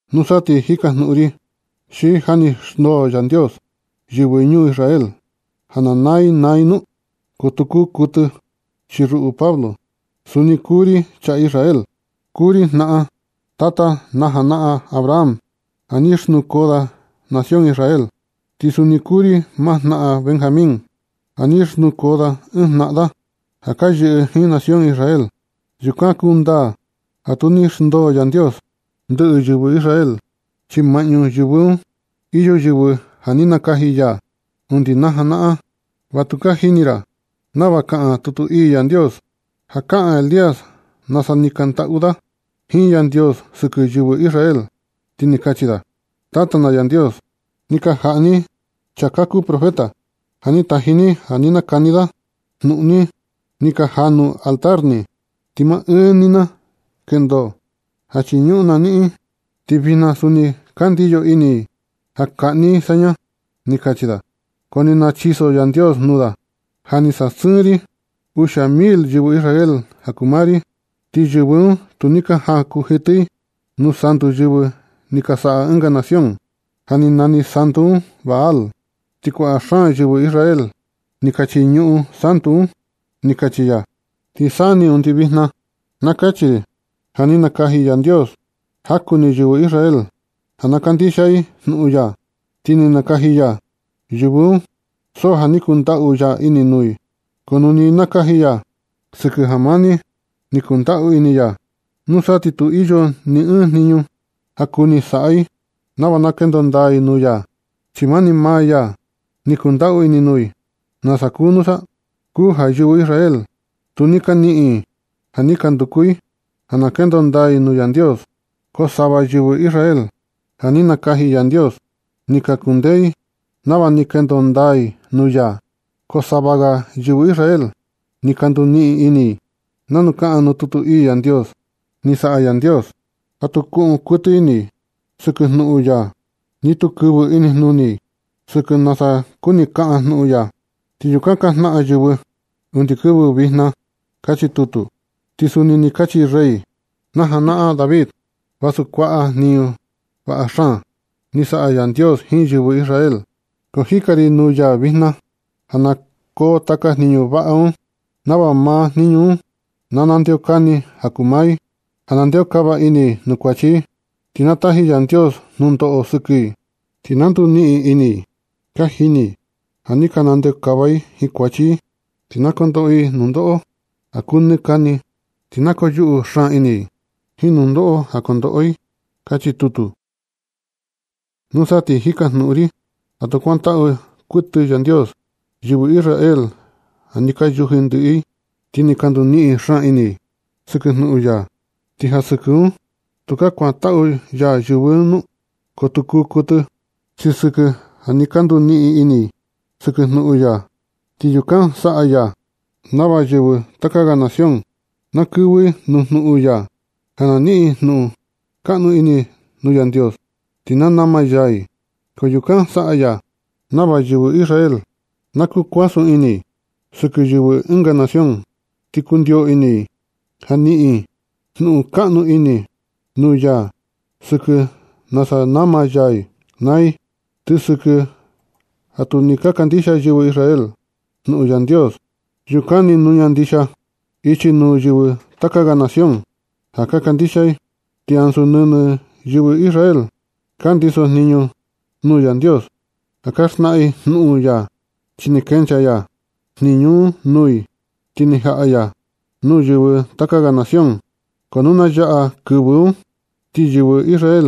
Nusa, ti jikajnuꞌun ri: ¿Xi ja ni xndoo Yandios yɨvɨ ñuu ya Israel, ja na naa i naa i nu? ¡Ko tu kuu kuɨtɨ! Chi ruꞌu Pablo, suni kuu ri chaa Israel. Kuu ri jnaꞌan tata najanaꞌan Abraham ja ni xnukoo da nación Israel, ti suni kuu ri jnaꞌan maa Benjamín, ja ni xnukoo da ɨɨn jnaꞌan da ja ka yɨꞌɨ jiin nación Israel. Yukan kundaa ja tu ni xndoo Yandios ndɨꞌɨ yɨvɨ Israel, chi maꞌñu yɨvɨ un iyo yɨvɨ ja ni nakaji ya undi najanaꞌan. Va tu ka jini ra nava kaꞌan tutu ii Yandios, ja kaꞌan Elías nasa ni kaꞌan ndaꞌu da jiin Yandios sɨkɨ yɨvɨ Israel, ti ni kachi da: “Tata na Yandios, ni ka jaꞌni i chaa ka kuu profeta ja ni taji ni ja na nakani da jnuꞌun ni. Ni ka janu i altar ni, ti maa ɨɨn ni na kendo ja chiñuꞌun na niꞌin. Ti vijna suni ka ndiyo ini i ja kaꞌni i saña”, ni kachi da. Ko ni nachiso Yandios nuu da: “Ja ni sasɨɨn ri uxia mil yɨvɨ Israel ja kuu maa ri, ti yɨvɨ un tu ni ka jakunjitɨ i nuu santu ni ka saꞌa yɨvɨ ɨnga nación, ja nani santu un Baal. Ti kuaꞌa xaan yɨvɨ Israel ni ka chiñuꞌun i santu un”, ni kachi ya. Ti sa ni undi vijna, na kachi ri ja ni nakaji Yandios jaku ni yɨvɨ Israel ja na kandixia i jnuꞌun ya. Ti ni nakaji ya yɨvɨ un so ja ni kundaꞌu ini ya nuu i. Ko nu ni nakaji ya sɨkɨ ja mani ni kundaꞌu ini ya, nusa ti tu iyo ni ɨɨn jniñu ja kuni saꞌa i nava na kendo ndaa nuu ya, chi mani maa ya ni kundaꞌu ini nuu i. ¿Nasa kuu nusa? Kuu ja yɨvɨ Israel tu ni ka i niꞌin ja ni ka nduku i ja na kendo ndaa i nuu Yandios. Ko sava yɨvɨ Israel ja ni nakaji Yandios, ni ka kundee i nava ni ka kendo ndaa i nuu ya. Ko sava ga yɨvɨ Israel ni ka nduniꞌin ini i, nanu kaꞌan nuu tutu ii Yandios: “Ni saꞌa Yandios ja tu kuꞌun kuɨtɨ ini i sɨkɨ jnuꞌun ya, ni tu kɨvɨ inijnuni i sɨkɨ nasa kuni kaꞌan jnuꞌun ya, ti yukan ka jnaꞌan yɨvɨ undi kɨvɨ vijna”, kachi tutu. Ti suni ni kachi rey na janaꞌan David: Vasu kuaꞌa jniñu vaꞌa xaan ni saꞌa Yandios jiin yɨvɨ Israel, ko jikan ri nuu ya vijna ja na koo taka jniñu vaꞌa un, nava maa jniñu un na ndeokani ja kuu maa i, ja na ndeokava ini i nuu kuachi, ti na taji Yandios nundoꞌo sɨkɨ i. Ti na nduniꞌin ini i ka jini i ja ni ka ndeokava i jiin kuachi. Ti na kondoꞌo i nundoꞌo ja kuu nɨ kani, ti na koyuꞌu xaan ini i jiin nundoꞌo ka kondoꞌo i. Kachi tutu. Nusa ti jikajnuꞌun ri: ¿Ja tu kuantaꞌu kuɨtɨ Yandios yɨvɨ Israel sɨkɨ ja ni ka yuji ndɨꞌɨ i, ti ni ka nduniꞌin xaan ini i sɨkɨ jnuꞌun ya nu? ¿Ti ja sɨkɨ un tukaa kuantaꞌu ya maa i nu? ¡Ko tu kuu kuɨtɨ! Chi sɨkɨ ja ni ka nduniꞌin ini i sɨkɨ jnuꞌun ya, ti yukan saꞌa ya nava yɨvɨ taka ga nación na kɨvɨ i nuu jnuꞌun ya ja na niꞌin jnuꞌun kaꞌnu ini nuu Yandios, ti na nama ya i. Ko yukan saꞌa ya nava yɨvɨ Israel na kuasun ini sɨkɨ yɨvɨ ɨnga nación, ti kundio ini i ja niꞌin jnuꞌun kaꞌnu ini nuu ya, sɨkɨ nasa nama ya i naa i. Ti sɨkɨ ja tu ni ka kandixia yɨvɨ Israel jnuꞌun Yandios, yukan ni nuña ndixia ichi nuu yɨvɨ taka ga nación ja ka kandixia i. Ti ansu nɨnɨ yɨvɨ Israel ka ndisojniñu nuu Yandios ja ka xnaꞌan i jnuꞌun ya, chi ni kenchaa ya jniñu un nuu i, ti ni jaꞌa ya nuu yɨvɨ taka ga nación. Ko nu na yaꞌa kɨvɨ un, ti yɨvɨ Israel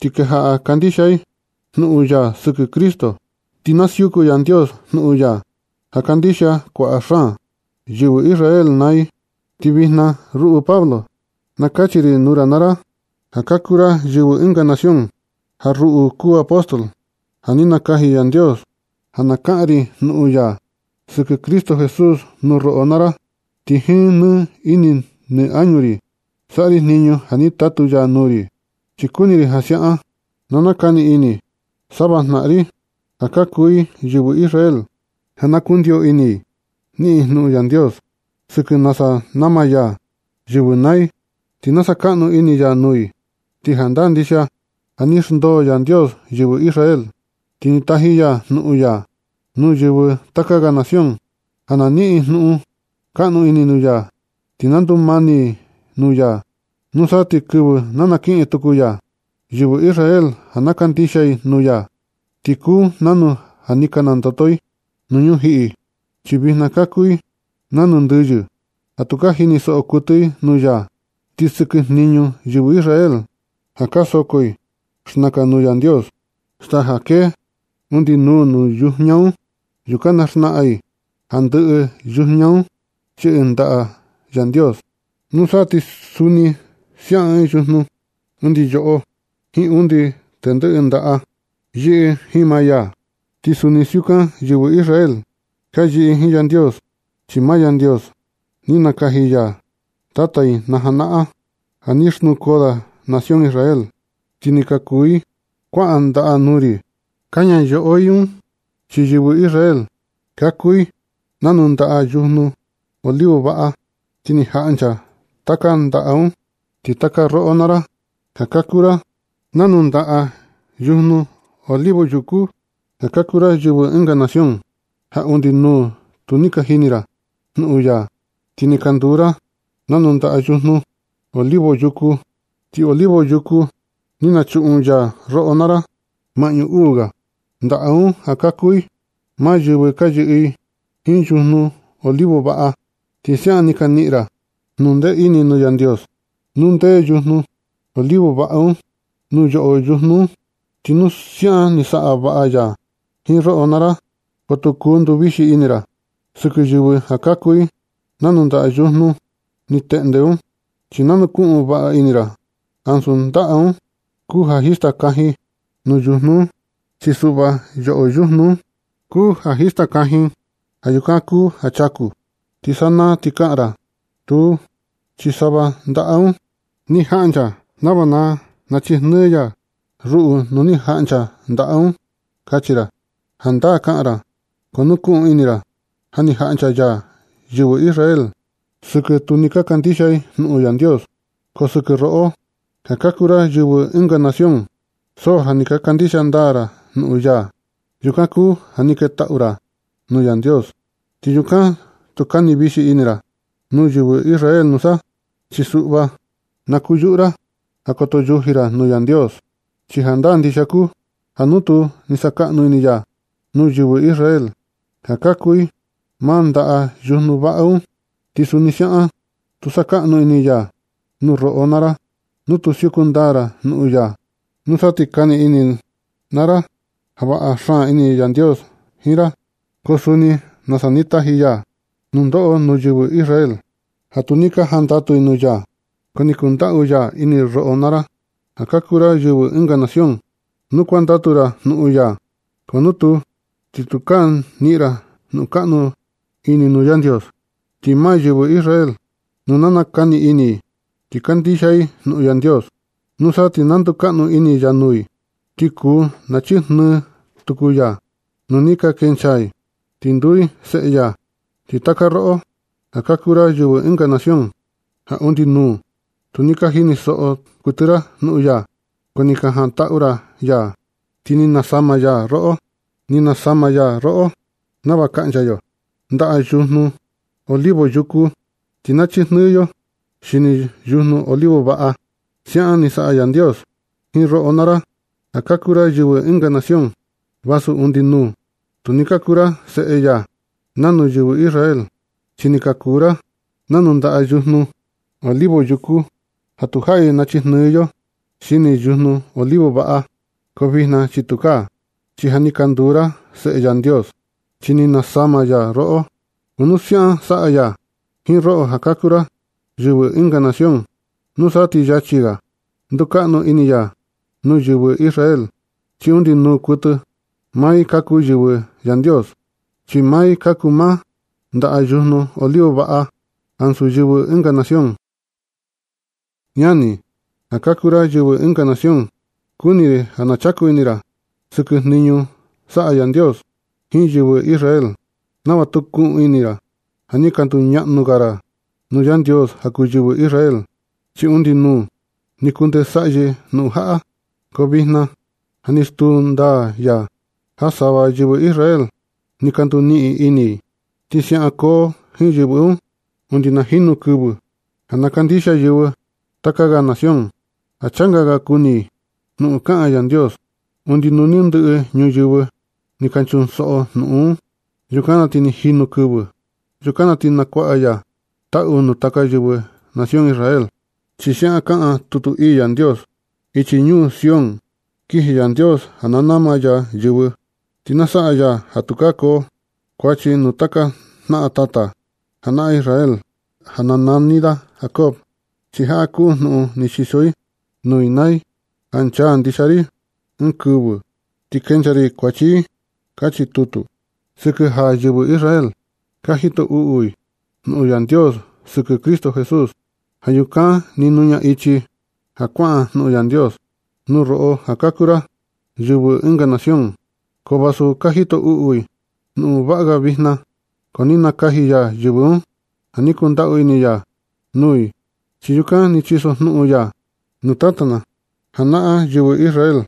ti kejaꞌa kandixia i jnuꞌun ya sɨkɨ Cristo, ti na siuku Yandios jnuꞌun ya ja kandixia kuaꞌa xaan yɨvɨ Israel naa i. Ko vijna ruꞌu Pablo na kachi ri nuu ra naa ra, ja ka kuu ra yɨvɨ ɨnga nación, ja ruꞌu kuu apóstol ja ni nakaji Yandios, ja na kaꞌan ri jnuꞌun ya sɨkɨ Cristo Jesús nuu roꞌo naa ra. Ti jiin nɨ ini nɨ añu ri saꞌa ri jniñu un ja ni tatu ya nuu ri. Chi kuni ri ja siaꞌan na nakani ini sava jnaꞌan ri, ja ka kuu i yɨvɨ Israel, ja na kundio ini i niꞌin i jnuꞌun Yandios sɨkɨ nasa nama ya yɨvɨ naa i, ti sakaꞌnu ini ya nuu i. Ti jandaa ndixia ja ni xndoo Yandios yɨvɨ Israel, ti ni taji ya jnuꞌun ya nuu yɨvɨ taka ga nación ja na niꞌin i jnuꞌun kaꞌnu ini nuu ya, ti na ndumani i nuu ya. Nusa ti kɨvɨ na nakiꞌin tuku ya yɨvɨ Israel ja na kandixia i jnuꞌun ya, ti kuu nanu ja ni ka nandoto i nuu ñujiꞌi, chi vijna ka kuu i nanu ndɨyɨ ja tu ka jinisoꞌo kuɨtɨ i jnuꞌun ya. Ti sɨkɨ jniñu yɨvɨ Israel ja ka soko i xnakan nuu Yandios staa ja kee undi nuu nuu yujña un, yukan ka xnaꞌan i ja ndɨꞌɨ yujña un yɨꞌɨ ndaꞌa Yandios. Nusa ti suni siaꞌan ɨɨn yujnu, undi yoꞌo jiin undi tendɨꞌɨ ndaꞌa yɨꞌɨ jiin maa. Ti suni siukan yɨvɨ Israel ka yɨꞌɨ i jiin Yandios, chi maa Yandios ni nakaji ya tata i najanaꞌan ja ni xnukoo da nación Israel, ti ni ka kuu i kuaꞌa ndaꞌa nuu ri kaña yoꞌo i un, chi yɨvɨ Israel ka kuu i nanu ndaꞌa ɨɨn yujnu olivo vaꞌa. Ti ni jaꞌncha taka ndaꞌa un. Ti taka roꞌo naa ra ja ka kuu ra nanu ndaꞌa yujnu olivo yukú, ja ka kuu ra yɨvɨ ɨnga nación, ja undi nuu tu ni ka jini ra jnuꞌun ya, ni ka nduu ra nanu ndaꞌa yujnu olivo yukú. Ti olivo yukú ni nachuꞌun ya roꞌo naa ra maꞌñu uu ga ndaꞌa un ja ka kuu i maa yɨvɨ ka yɨꞌɨ jiin yujnu olivo vaꞌa. Ti siaꞌan ni ka niꞌin ra jnundee ini nuu Yandios, nuu ndee yujnu olivo vaꞌa un nuu yoꞌo yujnu un. Ti nu siaꞌan ni saꞌa vaꞌa ya jiin roꞌo naa ra, ko tu kuu nduvixi ini ra sɨkɨ yɨvɨ ja ka kuu i nanu ndaꞌa yujnu ni teꞌnde un. Chi na nukuꞌun vaꞌa ini ra ja ansu ndaꞌa un kuu ja jista kajin nuu yujnu un. Chi suꞌva yoꞌo yujnu un kuu ja jista kajin. Ja yukan kuu ja chaku. Ti sanaa ti kaꞌan ra: “Tuu, chi sava ndaꞌa un ni jaꞌncha nava na nachijnɨɨ ya ruꞌu nuu ni jaꞌncha ndaꞌa un”, kachi ra. Jandaa kaꞌan ra, ko nukuꞌun ini ra ja ni jaꞌncha ya yɨvɨ Israel un sɨkɨ tu ni ka kandixia i jnuꞌun Yandios. Ko sɨkɨ roꞌo ja ka kuu ra yɨvɨ ɨnga nación, so ja ni ka kandixia ndaa ra jnuꞌun ya. Yukan kuu ja ni ketaꞌu ra nuu Yandios. Ti yukan tu kani vixi ini ra nuu yɨvɨ Israel nusa. Chi suꞌva, na kuyuꞌu ra ja koto yuji ra nuu Yandios. Chi jandaa ndixia kuu ja nu tu ni sakaꞌnu ini ya nuu yɨvɨ Israel, ja ka kuu i maa ndaꞌa yujnu vaꞌa un, ti suni siaꞌan tu sakaꞌnu ini ya nuu roꞌo naa ra nu tu siuku ndaa ra jnuꞌun ya. Nusa ti kani ini naa ra ja vaꞌa xaan ini Yandios jiin ra, ko suni nasa ni taji ya nundoꞌo nuu yɨvɨ Israel ja tu ni ka jandatu i jnuꞌun ya. Ko ni kundaꞌu ini ya roꞌo naa ra, ja ka kuu ra yɨvɨ ɨnga nación nu kuandatu ra jnuꞌun ya. Ko nu tuu, ti tukaa niꞌin ra jnuꞌun kaꞌnu ini nuu Yandios. Ti maa yɨvɨ Israel, nu nakani ini i ti kandixia i jnuꞌun Yandios, nusa ti na ndukaꞌnu ini ya nuu i, ti kuu na chijnɨɨ ya tuku nu ni ka kenchaa i, ti nduu i seꞌe ya. Nusa ti taka roꞌo ja ka kuu ra yɨvɨ ɨnga nación, ja undi nuu tu ni ka jinisoꞌo kuɨtɨ ra jnuꞌun ya, ko ni jantaꞌu ya ti ni nasama ya roꞌo. Ni nasama ya roꞌo nava kaꞌncha yo ndaꞌa yujnu olivo yukú, ti nachijnɨɨ yo xini yujnu olivo vaꞌa. Siaꞌan ni saꞌa Yandios jiin roꞌo naa ra, ja ka kuu ra yɨvɨ ɨnga nación, vasu undi nuu tu ni ka kuu ra seꞌe ya nanu yɨvɨ Israel, chi ni ka kuu ra nanu ndaꞌa yujnu olivo yukú ja tu jaꞌi nachijnɨɨ yo xini yujnu olivo vaꞌa. Ko vijna chi tukaa, chi ja ni ka nduu ra seꞌe Yandios, chi ni nasama ya roꞌo. Ko nu siaꞌan saꞌa ya jiin roꞌo, ja ka kuu ra yɨvɨ ɨnga nación, nusa ti yachi ga ndukaꞌnu ini ya nuu yɨvɨ Israel, chi undi nuu kuɨtɨ maa i ka kuu maa yɨvɨ Yandios, chi maa i ka kuu maa ndaꞌa yujnu olivo vaꞌa ansu yɨvɨ ɨnga nación. Ñani, ja ka kuu ra yɨvɨ ɨnga nación, kuni ri ja na chaku ini ra sɨkɨ jniñu saꞌa Yandios jiin yɨvɨ Israel, nava tu kuꞌun ini ra ja ni ka nduñaꞌnu ga ra nuu Yandios ja kuu yɨvɨ Israel. Chi undi nuu ni kundee saꞌyɨ jnuꞌun jaꞌa, ko vijna ja ni stuu ndaa ya ja sava yɨvɨ Israel ni ka nduniꞌin ini i. Ti siaꞌan koo jiin yɨvɨ un undi na jinu kɨvɨ ja na kandixia yɨvɨ taka ga nación ja changa ga kuni i jnuꞌun kaꞌan Yandios, undi nu ni ndɨꞌɨ yɨvɨ ni ka ñusoꞌo jnuꞌun un, yukan na ti ni jinu kɨvɨ. Yukan na ti nakuaꞌa ya taꞌu nu ndɨꞌɨ yɨvɨ nación Israel, chi siaꞌan kaꞌan tutu ii Yandios: Ichi ñuu Sión kiji Yandios ja nama ya yɨvɨ. Ti na saꞌa ya ja tukaa koo kuachi nuu taka jnaꞌan tata najanaꞌan Israel ja nani da Jacob. Chi jaꞌa kuu jnuꞌun ni chiso ri nuu i naa i, ja nchaa ndixia ri ɨɨn kɨvɨ, ti kenchaa ri kuachi i. Kachi tutu. Sɨkɨ ja yɨvɨ Israel, ka jito uꞌu i jnuꞌun Yandios sɨkɨ Cristo Jesús, ja yukan ni nuña ichi ja kuaꞌan jnuꞌun Yandios nuu roꞌo ja ka kuu ra yɨvɨ ɨnga nación. Ko vasu ka jito uꞌu i jnuꞌun vaꞌa ga vijna, ko ni nakaji ya yɨvɨ un ja ni kundaꞌu ini ya nuu i, chi yukan ni chisojnuꞌun ya nuu tata na janaꞌan yɨvɨ Israel.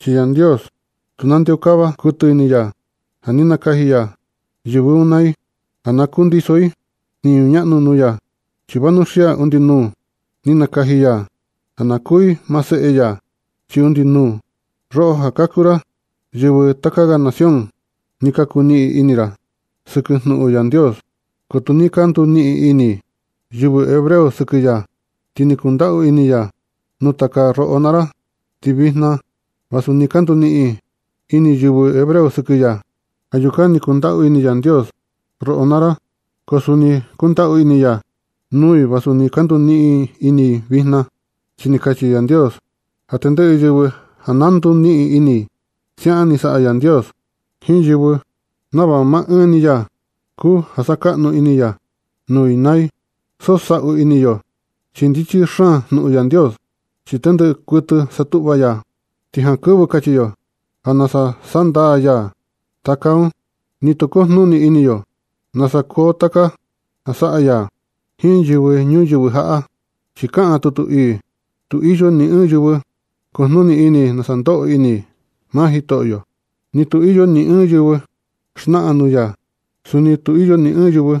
Chi Yandios tu nandeokava kuɨtɨ ini ya ja ni nakaji ya yɨvɨ un naa i ja kundiso i jniñu ñaꞌnu nuu ya, chi vanuxia undi nuu ni nakaji ya ja na kuu i maa seꞌe ya. Chi undi nuu, roꞌo ja ka kuu ra yɨvɨ taka ga nación, ni ka kuu niꞌin ini ra sɨkɨ jnuꞌun Yandios, ko nu ni ka nduniꞌin ini yɨvɨ hebreo sɨkɨ ya, ti ni kundaꞌu ini ya nuu taka roꞌo naa ra. Ti vijna, vasu ni ka nduniꞌin ini yɨvɨ hebreo sɨkɨ ya. Ja yukan ni kundaꞌu ini Yandios roꞌo naa ra, ko suni kundaꞌu ini ya nuu i vasu ni ka nduniꞌin ini i vijna. Chi ni kachi Yandios ja tendɨꞌɨ yɨvɨ na nduniꞌin ini i. Siaꞌan ni saꞌa Yandios jiin yɨvɨ nava maa ɨɨn ni maa ya kuu ja sakaꞌnu ini ya nuu i naa i. So saꞌu ini yo chi ndichi xaan jnuꞌun Yandios, chi tendɨꞌɨ kuɨtɨ ni satuꞌva ya. Ti jankɨvɨ kachi yo ja nasa sandaa ya taka un. Ni tu kujnuni ini yo nasa kuu taka ja saꞌa ya jiin yɨvɨ ñuyɨvɨ jaꞌa. Chi kaꞌan tutu ii: “¡Tu iyo ni ɨɨn yɨvɨ kujnuni ini nasa ndoꞌo ini maa Jitoꞌyo! ¡Ni tu iyo ni ɨɨn yɨvɨ xnaꞌan nuu ya! ¡Suni tu iyo ni ɨɨn yɨvɨ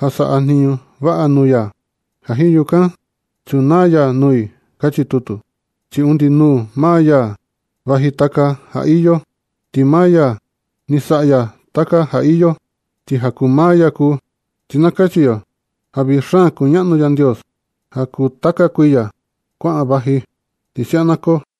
ja saꞌa jniñu vaꞌa nuu ya, ja jiin yukan nachunaa ya nuu i”! ―kachi tutu. Chi undi nuu maa ya vaji taka ja iyo, ti maa ya ni saꞌa ya taka ja iyo, ti ja kuu maa ya kuu. Ti na kachi yo ja vii xaan kuñaꞌnu Yandios ja kuu taka kuiya kuaꞌan vaji. Ti siaꞌan na koo.